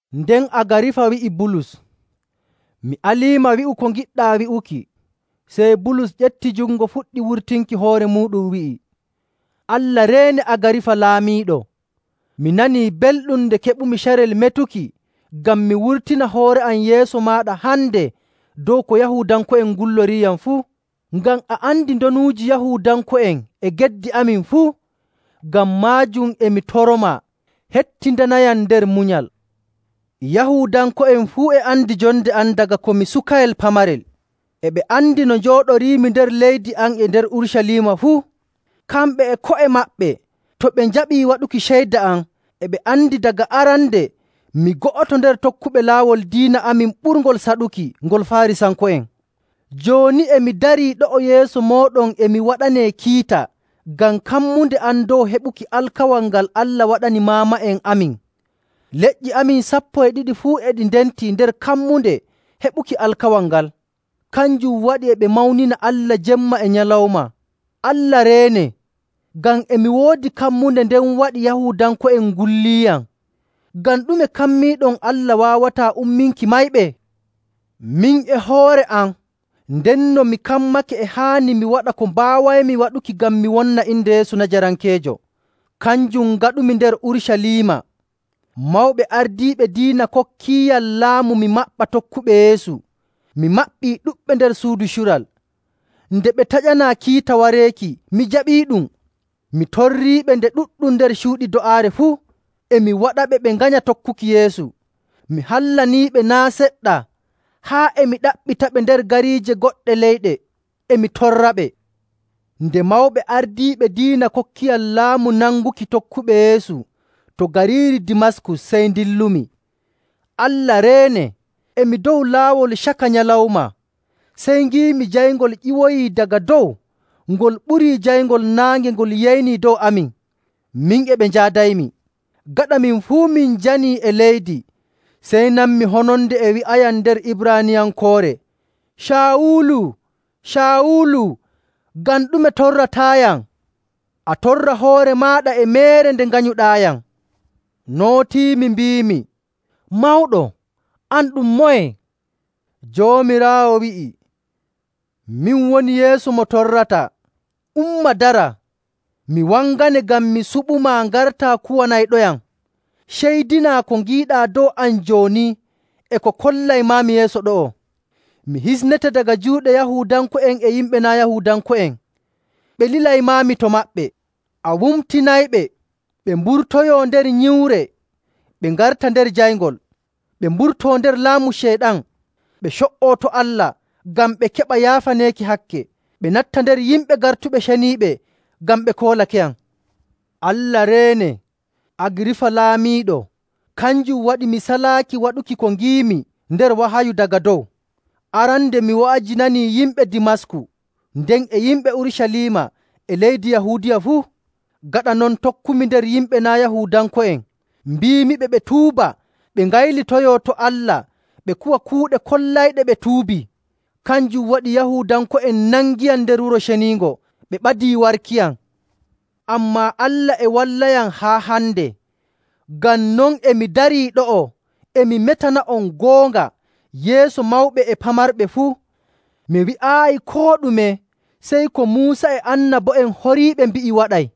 Nden Agarifa wi'i Bulus, “Mi aliima wi'u ko ngiɗɗaa wi'uki.” Sey Bulus ƴefti jungo fuɗɗi wurtinki hoore muuɗum, wi'i, “Allah reene, Agarifa laamiiɗo. Mi nanii belɗum nde keɓumi carel metuki ngam mi wurtina hoore am yeeso maaɗa hande dow ko Yahuudanko'en ngulloriiyam fuu, ngam a andi ndonuuji Yahuudanko'en e geddi amin fuu. Ngam maajum e mi toromaa, hettindanayam nder munyal. “Yahuudanko'en fuu e andi jonde am daga ko mi sukayel pamarel. E ɓe andi no njooɗoriimi nder leydi am e nder Urucaliima fuu. Kamɓe e ko'e maɓɓe, to ɓe njaɓii waɗuki ceyda am, e ɓe andi daga arande mi go'oto nder tokkuɓe laawol diina amin ɓurngol saɗuki ngol Faarisanko'en.. Jooni, e mi darii ɗo'o yeeso mooɗon e mi waɗanee kiita ngam kammunde am dow heɓuki alkawal ngal Allah waɗani maama'en amin. Leƴƴi amin sappo e ɗiɗi fuu e ndenti nder kammunde heɓuki alkawal ngal, kanjum waɗi e ɓe mawnina Allah jemma e nyalawma. Allah reene, ngam e mi woodi kammunde nden waɗi Yahuudanko'en ngulliiyam! Ngam ɗume kammiiɗon Allah waawataa umminki mayɓe? “Min e hoore am, ndenno mi kammake e haani mi waɗa ko mbaawaymi waɗuki ngam mi wonna inde Yeesu Najarankeejo. Kanjum ngaɗumi nder Urucaliima. Mawɓe ardiiɓe diina kokkiiyam laamu mi maɓɓa tokkuɓe Yeesu. Mi maɓɓi ɗuɗɓe nder suudu cural. Nde ɓe taƴanaa kiita wareeki, mi jaɓiiɗum. Mi torriiɓe nde ɗuɗɗum nder cuuɗi do'aare fuu. E mi waɗaɓe ɓe nganya tokkuki Yeesu. Mi hallaniiɓe naa' seɗɗa haa e mi ɗaɓɓitaɓe nder gariije goɗɗe leyɗe, e mi torraɓe.. “Nde mawɓe ardiiɓe diina kokkiyam laamu nanguki tokkuɓe Yeesu to gariiri Dimasku sey ndillumi. Allah reene, e mi dow laawol caka nyalawma, sey ngiimi jayngol ƴiwoyii daga dow ngol ɓurii jayngol naange ngol yeynii dow amin, min e ɓe njaadaymi. Gaɗa min fuu min njanii e leydi, sey nanmi hononde e wi'ayam nder Ibraaniyankoore, ‘Caawulu, Caawulu, ngam ɗume torrataayam? A torra hoore maaɗa e meere nde nganyuɗaayam.’ Nootiimi mbiimi, ‘Mawɗo, an ɗum moye?’ Joomiraawo wi'i, ‘Min woni Yeesu mo torrataa. Umma dara. Mi wangane ngam mi suɓumaa ngartaa kuwanayɗoyam, ceydinaa ko ngiiɗaa dow am jooni e ko kollaymaami yeeso ɗo'o. Mi hisnete daga juuɗe Yahuudanko'en e yimɓe naa' Yahuudanko'en, ɓe lilaymaami to maɓɓe. A wumtinayɓe, ɓe mburtoyoo nder nyiwre, ɓe ngarta nder jayngol, ɓe mburtoo nder laamu Ceyɗan, ɓe co''oo to Allah, ngam ɓe keɓa yaafaneeki hakke, ɓe natta nder yimɓe gartuɓe ceniiɓe ngam ɓe koolakeyam.’ “Allah reene, Agarifa Laamiiɗo, kanjum waɗi mi salaaki waɗuki ko ngiimi nder wahayu daga dow. Arande mi wa'ajinanii yimɓe Dimasku, nden e yimɓe Urucaliima e leydi Yahuudiya fuu. Gaɗa non tokkumi nder yimɓe naa' Yahuudanko'en, mbiimiɓe ɓe tuuba, ɓe ngaylitoyoo to Allah, ɓe kuwa kuuɗe kollayɗe ɓe tuubii.. Kanjum waɗi Yahuudanko'en nangiyam nder Wuro Ceniingo, ɓe ɓadii warkiyam. Ammaa Allah e wallayam haa hande. Ngam non e mi darii ɗo'o e mi metana'on goonga yeeso mawɓe e pamarɓe fuu. Mi wi'aayi koo ɗume sey ko Muusa e annabo'en horiiɓe mbi'i waɗay,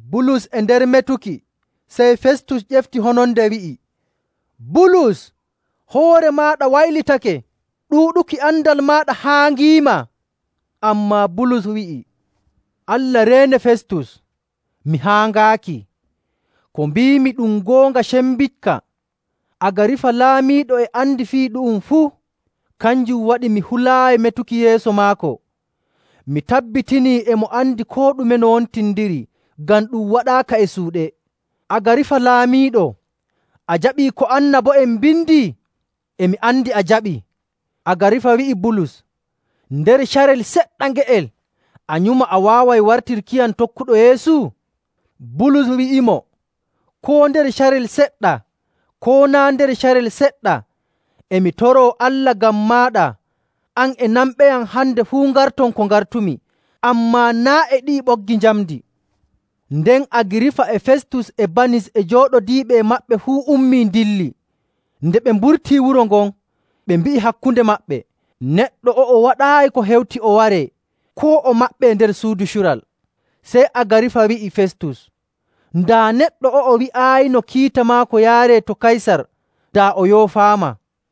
Bulus e nder metuki, sey Festus ƴefti hononde, wi'i, “Bulus, hoore maaɗa waylitake! Ɗuuɗuki andal maaɗa haaŋiima!” Ammaa Bulus wi'i, “Allah reene, Festus, mi haaŋaaki. Ko mbiimi ɗum goonga cembiɗka. Agarifa laamiiɗo e andi fii ɗu'um fuu. Kanjum waɗi mi hulaayi metuki yeeso maako. Mi tabbitinii e mo andi koo ɗume no wontindiri, ngam ɗum waɗaaka e suuɗe. Agarifa laamiiɗo! A jaɓii ko annabo'en mbindi? E mi andi a jaɓii!” Agarifa wi'i Bulus, “Nder carel seɗɗa nge'el a nyuma a waaway wartirkiyam tokkuɗo Yeesu?” Bulus wi'imo, “Koo nder carel seɗɗa, koo naa' nder carel seɗɗa, e mi toroo Allah ngam maaɗa an e nanɓeyam hande fuu ngarton ko ngartumi, ammaa naa' e ɗi'i ɓoggi njamndi.” Nden Agarifa e Festus e Banis e jooɗodiiɓe e maɓɓe fuu ummii, ndilli. Nde ɓe mburtii wuro ngon, ɓe mbi'i hakkunde maɓɓe, “Neɗɗo o'o waɗaayi ko hewti o waree koo o maɓɓe nder suudu cural.” Sey Agarifa wi'i Festus, “Daa neɗɗo o'o wi'aayino kiita maako yaaree to Kaysar, daa o yoofaama.”